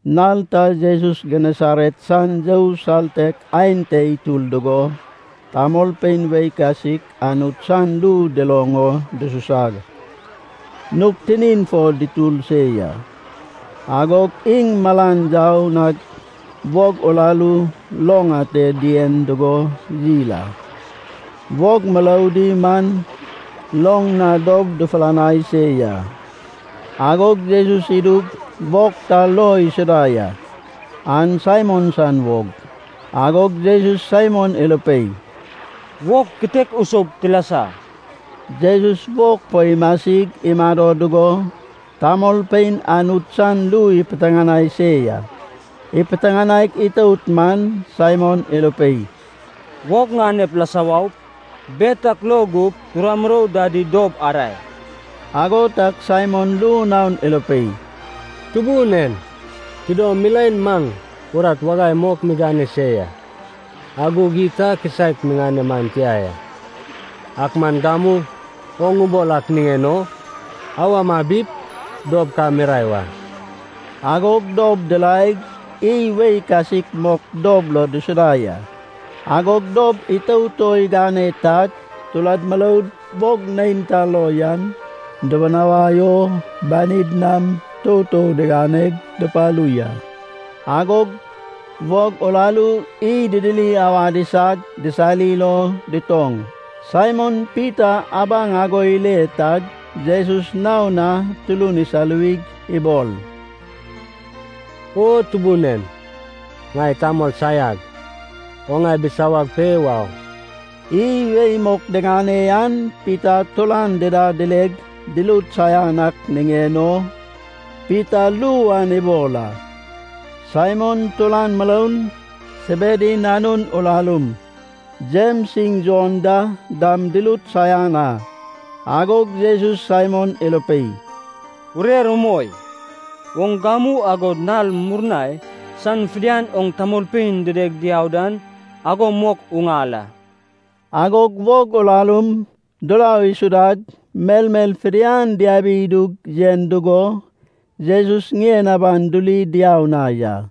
Nal ta Jesus Genesaret san you saltek aen te itur dugo tamolpein wei kasik Anut san ru duloŋ o dususag, nug tinin fo dutur se ya. Agog iŋ malan yau nag, wog urarum loŋ ate dien dugo yil a. Wog muroudi man loŋ na dob dufulanai se ya. Agog Jesus idug, wog ta lo isuda ya. An Saimon san wog. Agog Jesus Saimon irupei, “Wog kitek usoup tilasa.” Jesus wog fo imasig imado dugo tamolpein Anut san ru ipiteŋanai se ya. Ipiteŋanaig itout man Saimon irupei, “Wog ŋanep lasa waup, bet ak lo gup tura murou dadi dob arae.” Ago tag Saimon ru naon irupei, “Tubun en, tidom milaen maŋ urat wagai mok migane se ya, ak gug iy ta kisaek miŋane man tia ya. Ak man gamu oŋ ubol ak niŋen o awa mabip dob ka mirae wa.” Agog dob diraeg, iy wei kasik mok dob lo dusuda ya. Agog dob itout o igane tag, turad muroud wog neinta lo yan dibinawai o banid nam toutou diganeg dupalu ya. Agog wog urarum iy didiri awad isag disarir o dutoŋ. Saimon Pita abaŋ ago ile tag Jesus naon na turun isaluwig ibol, “O Tubun en, ŋai tamol saiag. Oŋ ŋai bisawag pe wau.” Iy wei mok diŋane an Pita turan dida dileg, durut saian ak niŋen o Pita ru an ibol a. Saimon turan muroun, Sebedi nanun urarum, Jems iŋ Jon da dam durut saian a. Agog Jesus Saimon irupei, “Urer umoi. Oŋ gamu agod nal murnai san fidian oŋ tamolpein dideg diau dan ago mok uŋal a.” Agog wog urarum durau isudag melmel fidian diabi idug yen dugo Jesus ŋien aban duri diau na ya.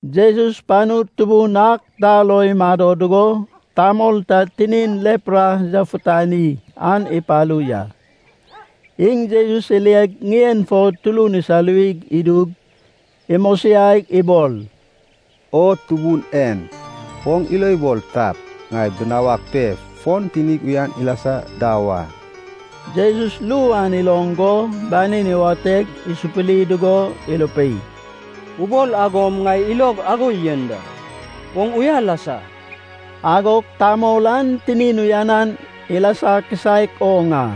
Jesus panu tubun ak ta lo imado dugo, tamol ta tinin lepra yafutani an ipalu ya. Iŋ Jesus ileg ŋien fo turun isaluwi idug, imosiaig ibol, “O Tubun en, oŋ ilo ibol tap, ŋai binawag pe fon tinig uyan ilasa da wa.” Jesus ru an iloŋ go banin iwateg isupuri dugo irupei, “Ubol agom ŋai ilog ago yen da, oŋ uya lasa.” Agog tamol an tinin uyan ilasa kisaek oŋ a.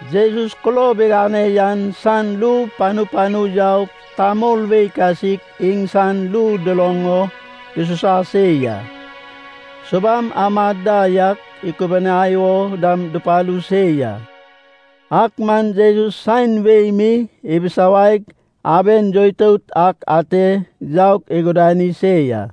Jesus kulob igane yan san ru panu panu yaug, tamol wei kasik iŋsan ru duloŋ o dususa se ya. Subam amad da yak ikubuniai o dam dupalu se ya. Ak man Jesus saen wei mi ibisawaig, aben yoitout ak ate yaug igudani se ya.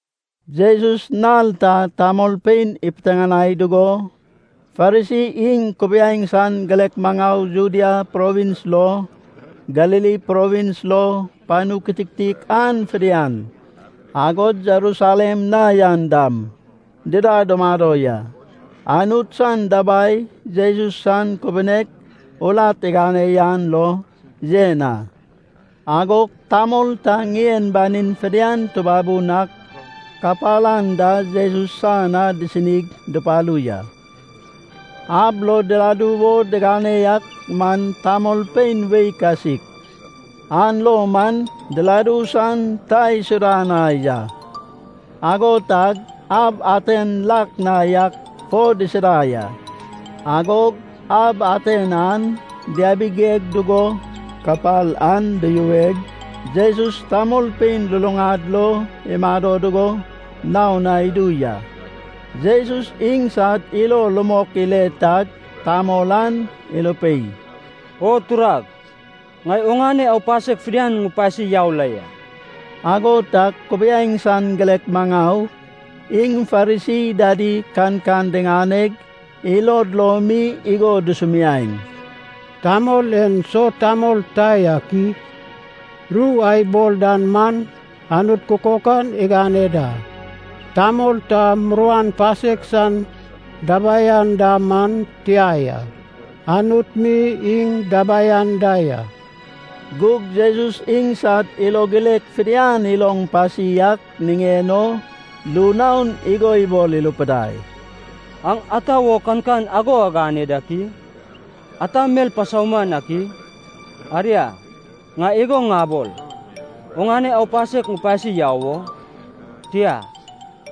Jesus nal ta tamolpein ipiteŋanai dugo, Farisi iŋ kubiaeŋ san girek maŋau Judea provins lo, Galili Provins lo panu kititik an fidian, agod Jerusalem na yan dam dida dumado ya. Anut san dabai Jesus san kubunek urat igane yan lo yen a. Agog tamol ta ŋien banin fidian tubabun ak kapal anda Jesus san na disinig dupalu ya. Ab lo diladu wo digane ak man tamolpein wei kasik, an lo man diladu san ta isuda na ya. Ago tag ab aten lak na yak fo disida ya. Agog ab aten an diabigigeg dugo kapal an duyuweg, Jesus tamolpein luluŋad lo imado dugo naon na idu ya. Jesus iŋsad ilo rumok ile tag tamol an irupei, “O turag, ŋai oŋane aupasek fidian ŋupasi yau la ya.” Ago tag kubiaeŋ san girek maŋau, iŋ Farisi dadi kankan diŋaneg ilod lo mi igo dusumiaeŋ, “Tamol en so tamol ta yak i? Ru a ibol dan man Anut kukokan igane da. Tamol ta muruan pasek san dabai anda man tia ya, Anut mi iŋ dabai anda ya.” Gug Jesus iŋsad ilo girek fidian iloŋ pasi ak niŋen o ru naon igo ibol irupidai, “Aŋ ata wo kankan ago agane dak i? Ata mel pasauman ak i? Aria, ŋai igo ŋabol, ‘Oŋane aupasek ŋupasi yau wo?’ Tia,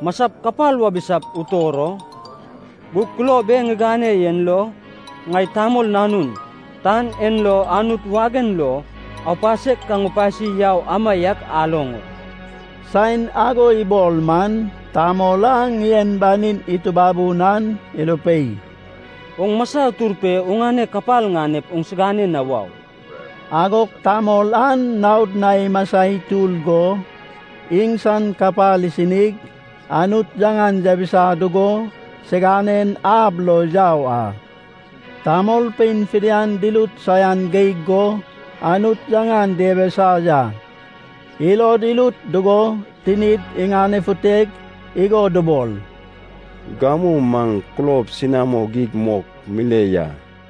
‘Masap kapal wabisap utor o?’ Gug kulob e ŋigane en lo ŋai, Tamol Nanun, tan en lo Anut wagen lo aupasek ka ŋupasi yau amaiak aloŋ o...” saen ago ibol man, tamol a ŋien banin itubabun an irupei, “Oŋ masa utur pe oŋane kapal ŋanep oŋsigane na wau.” Agog tamol an naod na imasa itur go, iŋsan kapal isinig, Anut yaŋan yabisa dugo, siganen ab lo yau a. Tamolpein fidian durut saian geig go Anut yaŋan diabisa ya. Ilod irut dugo tinid iŋanefuteg igo dubol, “Gamu maŋ kulob senamo geig mok mile ya.”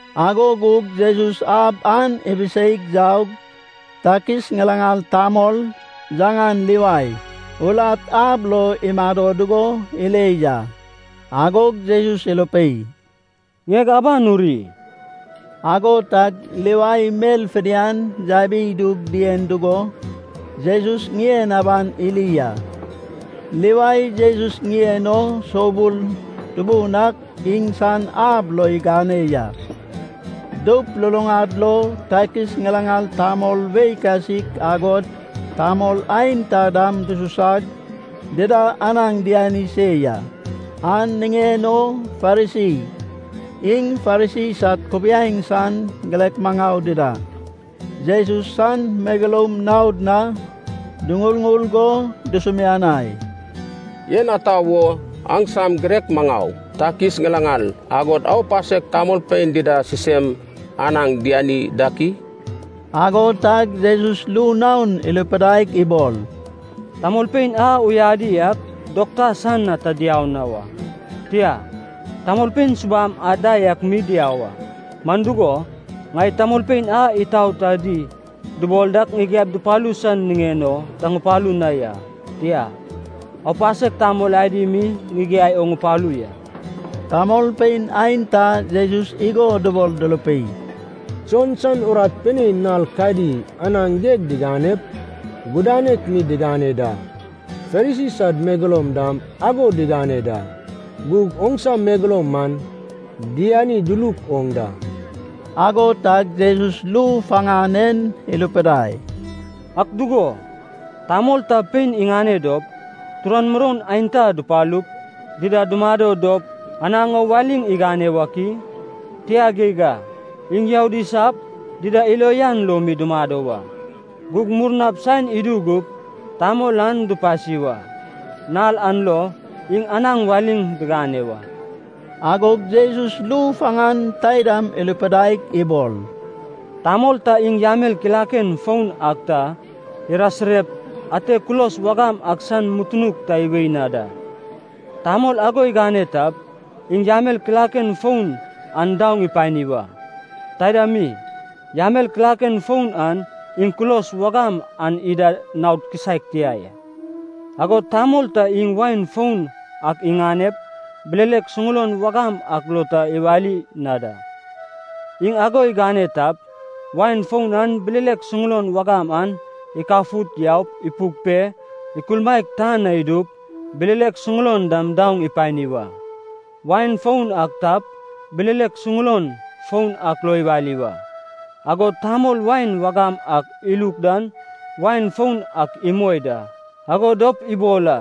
Ago gug Jesus ab an ibiseig yaug, takis ŋilaŋal tamol, yaŋan Livai, urat ab lo imado dugo ile ya. Agog Jesus irupei, “Ŋieg aban uri.” Ago tag Livai mel fidian yabidug dien dugo, Jesus ŋien aban iri a. Livai Jesus niŋen o soubul tubun ak iŋsan ab lo igane ya. Doup luluŋad lo takis ŋilaŋal tamol wei kasik agod tamol aenta dam dususag, dida anaŋ diani se ya. An niŋen o Farisi, iŋ Farisi sad kubiaeŋ san girek maŋau dida Jesus san megeloum naod na duŋurŋur go dusumianai, “En ata wo aŋsam girek maŋau takis ŋilaŋal, agod aupasek tamolpein dida sisem anaŋ diani dak i?” Ago tag Jesus ru naon irupidaig ibol, “Tamolpein a uyadi ak dokta san na ta diau na wa, tia, tamolpein subam anda yak mi diau a. Man dugo, ŋai tamolpein a itaot adi dubol dak ŋigiaip dupalu san niŋen o ta ŋupalu na ya, tia, aupasek tamol adi mi ŋigiai o ŋupalu ya.” Tamolpein aenta Jesus igo dubol durupei, “Jon san urat pinein nal kadi anaŋ geg diganep, gudanek mi digane da. Farisi sad megeloum dam ago digane da. Gug oŋsa megeloum man diani duluk oŋ da.” Ago tag Jesus ru faŋan en irupidai, “Ak dugo, tamol ta pein iŋane dop, turan muroun aenta dupalup, dida dumado dop anaŋ o waliŋ igane wak i? Tia geig a. Iŋ youd isap, dida ilo uyan lo mi dumado wa. Gug murnap saen idu gup, tamol an dupasi wa. Nal an lo, iŋ anaŋ waliŋ digane wa.” Agog Jesus ru faŋan taidam irupidaig ibol, “Tamol ta iŋ yamel kilaken foun ak ta irasirep ate kulos wagam ak san mutunuk ta iwei na da. Tamol ago igane tap, iŋ yamel kilaken foun an daoŋ ipani wa. Taida mi, yamel kilaken foun an iŋ kulos wagam an ida naod kisaek tia ya. Agod tamol ta iŋ wain foun ak iŋanep, bilelek suŋulon wagam ak lo ta iwali na da. Iŋ ago igane tap, wain foun an bilelek suŋulon wagam an ikafut yaup ipuk pe, ikulmaek, tan na idup, bilelek suŋulon dam daoŋ ipani wa. Wain foun ak tap, bilelek suŋulon foun ak lo iwali wa. Agod tamol wain wagam ak iluk dan wain foun ak imoi da. Ago dop ibol a,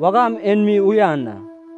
‘Wagam en mi uyan a.’”